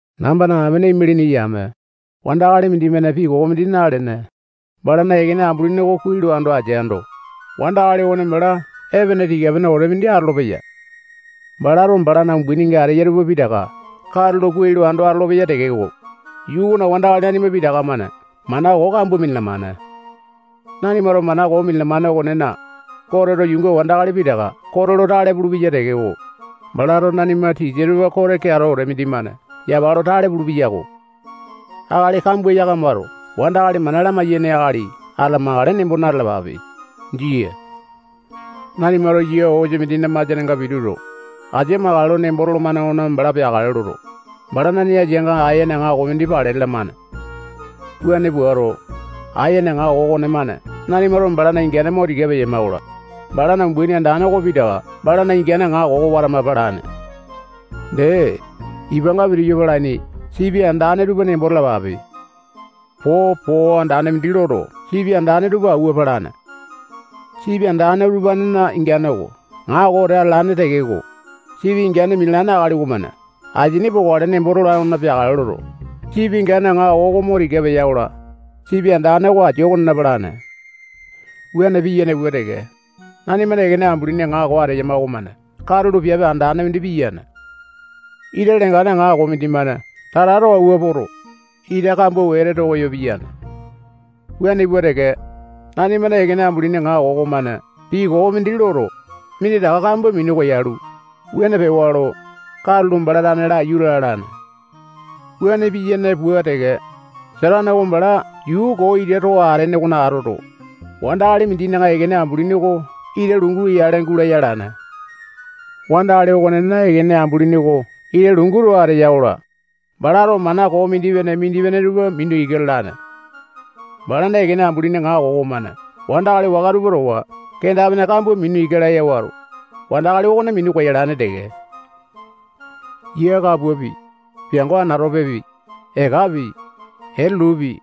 Nambana amene imalini yame, wandakali mindimane pii koo mindi nalene, balana ekene ambulini oko kuai lo ando ateando, wandakali okone bala epene tika-pene wete mindi atolopeyai. Balato balana umbaininga ateya tupa pitaka katulo kuai lo ando atolopeya tekeko, yuu okona wandakali nanima pitaka-mane mana koo kambua minalamane. Nanimato mana koo minalamane okonena, Goteto yuunga wandakali pitaka kote lo tale pulupeya tekeko, balato nanima tisa tupa kote keato wete mindimane yapa lo tale pulupeya-ko. Akali kambua yakamato wandakali mana lamai-yaini akali atamakale nembo na-talapape. Jia. Nanimato yia osa mindina masianenga pituto, asia makale nembo tolomane okona bala peakale loto, balana nee asianga aene aŋako mindi pale lalamane. Wuane puato, aene aŋako okonemane nanimato balana ingane mo tika peyama-kola, balana umbaini andane oko pitaka balana ingane aŋako oko watama palane. Dee, ipanga pitiyu palaini sipi andane tupa nembo talapape. Popo andane mindi loto, sipi andane tupa awua palane. Sipi andane utupanena ingane oko aŋako wete atalane tekeko, sipi ingane minalane akali okomane asini pokale nembo tolane okona peakale loto, sipi ingane aŋako oko mo tika peya-kola, sipi andane oko asia okonena palane. Wuane piyane pua teke, nanimana ekene ambulini aŋako ateyama okomane katulo piape andane mindi piyane. Ita lengane aŋako mindimane tata too awua poto, ita kambua wete too koyo piyane. Wuane pua teke, nanimana ekene ambulini aŋako okomane pii koo mindi loto, minditaka kambua minu koyalu, wuane pewa lo, katulo bala tane laiyu lalane. Wuane piyane pua teke, Satane oko bala yuu koo ita too atene okona atoto, wandakali mindina ekene ambulini oko ita lungu yale gulaya alane. Wandakali okonena ekene ambulini oko ita lungu too ateya-kola, balato mana koo mindipene-mindipene tupa mina ika lalane. Balana ekene ambulini aŋako okomane wandakali waka tupa towa kenda-pene kambua mina ika laya wato, wandakali okone minu koyalane teke. Yia kapuapi, piango anatopepi, ekapi, etulupi,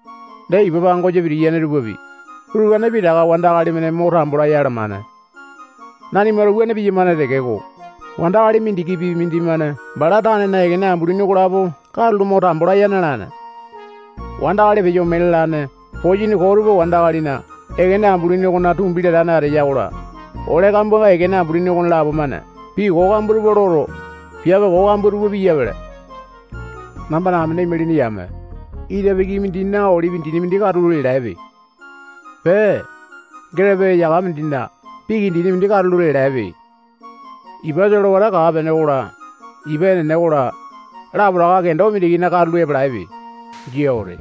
dee ipa pangosa pitiyane tupapi, utupane pitaka wandakali-mane mo tambo laya alamane. Nanimato wuane piyamane tekeko, wandakali mindikipi mindimane bala tanena ekene ambulini okolapo katulo mo tambo laya na-alane. Wandakali peyo ome lalane posini koo tupa wandakalina ekene ambulini okona tumbi latane ateya-kola, ole kambuanga ekene ambulini okonelapo-mane pii koo kambua tupa loto, piape koo kambua tupa piyapele. Nambana amene imalini yame, ita piki mindina olipi dini mindi katulo lialaepe. Pee, getepe eyaka mindina piki dini mindi katulo lialaepe. Ipa solewata kaa-pene okola, ipa enene okola, lapotaka kendo mindikina katulo epalaepe. Jia wete.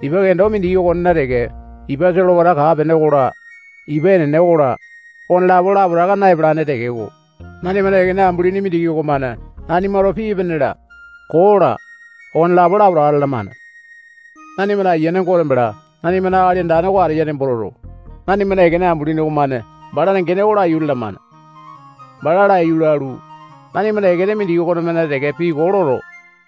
Ipa kendo mindiki okonena teke ipa solewata kaa-pene okola, ipa enene okola, okonelapo lapotaka na-epalane tekeko, nanimana ekene ambulini mindiki okomane nanimato pii epene-la, koo-la, okonelapo lapotaka lalamane. Nanimana Ayiane Gote bala nanimana Akali Andane oko ateya nembo toto, nanimana ekene ambulini okonemane balana gene oko laiyu lalamane. Bala laiyu lalu, nanimana ekene mindiki okonemane teke pii koo loto,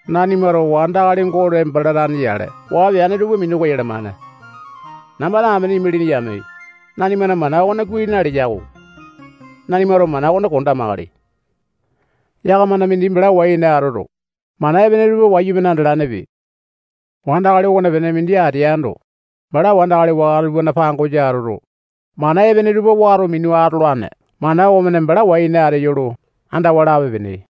nanimato wandakali Gote bala tane yale waa peane tupa minu koyalamane. Nambana amene imalini yame, nanimana mana okone kuai naleya-ko. Nanimato mana okone kondamakale. Yakamana mindi bala wai-ene atoto, mana epene tupa wayumane andalanepe. Wandakali okonepene mindi ateando, bala wandakali waka tupana pangosa atoto, mana epene tupa wato minu atolane mana okomane bala wai ene ateyo lo andawa lape-pene.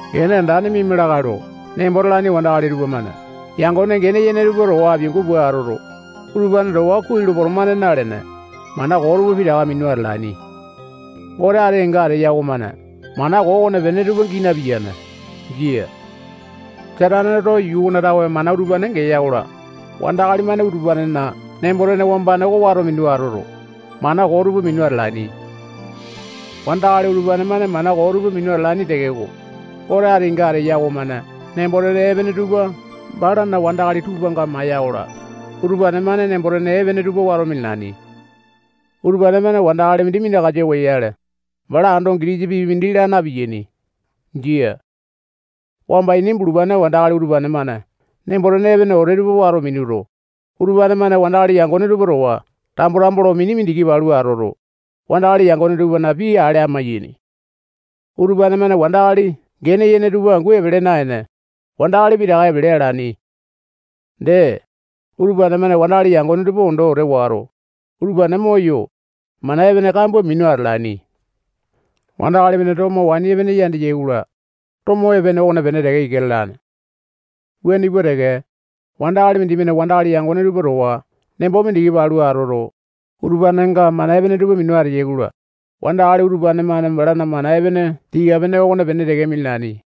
Gene andane miama lakae lo nembo talaini wandakali tupamane yangone gene yene tupa towa apiangu pua atoto, utupane towa kuai lo potomane nalene, mana koo tupa pitaka minu atalaini. Gote ati kenga ateya okomane mana koo okonepene tupa gii napiyane. Jia. Sataneto yuu okona tawe mana utupane geya-kola, wandakali-mane utupanena nembo-tene wambane oko wato minu atoto, mana koo tupa minu atalaini. Wandakali utupane-mane mana koo tupa minu atalaini tekeko, Gote ati kenga ateya okomane nembo-tene epene tupa balana wandakali tupanga maiya-kola, utupane-mane nembo-tene epene tupa wato minalaini. Utupane-mane wandakali mindi minakasa oyale, bala ando gitisa pii mindi laa na-piyaini. Jia. Wamba ini bulupane wandakali utupane-mane nembo-tene epene wete tupa wato minuto, utupane-mane wandakali yangone tupa towa tambo-tambo lo mini mindiki palu atoto, wandakali yangone tupana pii ale amaiyaini. Utupane-mane wandakali gene yene tupa angu epele naene, wandakali pitaka epele alaini. Dee, utupane-mane wandakali yangone tupa ondo wete wato, utupane moyo, mana epene kambua minu atalaini. Wandakali-mane tomo waini epene yandeya-kola, tomo epene okonepene teke ika lalane. Wuane pua teke, wandakali mindimane wandakali yangone tupa towa nembo mindiki palu atoto, utupanenga mana epene tupa minu ateya-kola, wandakali utupane-mane balana mana epene tika-pene okonepene teke minalaini.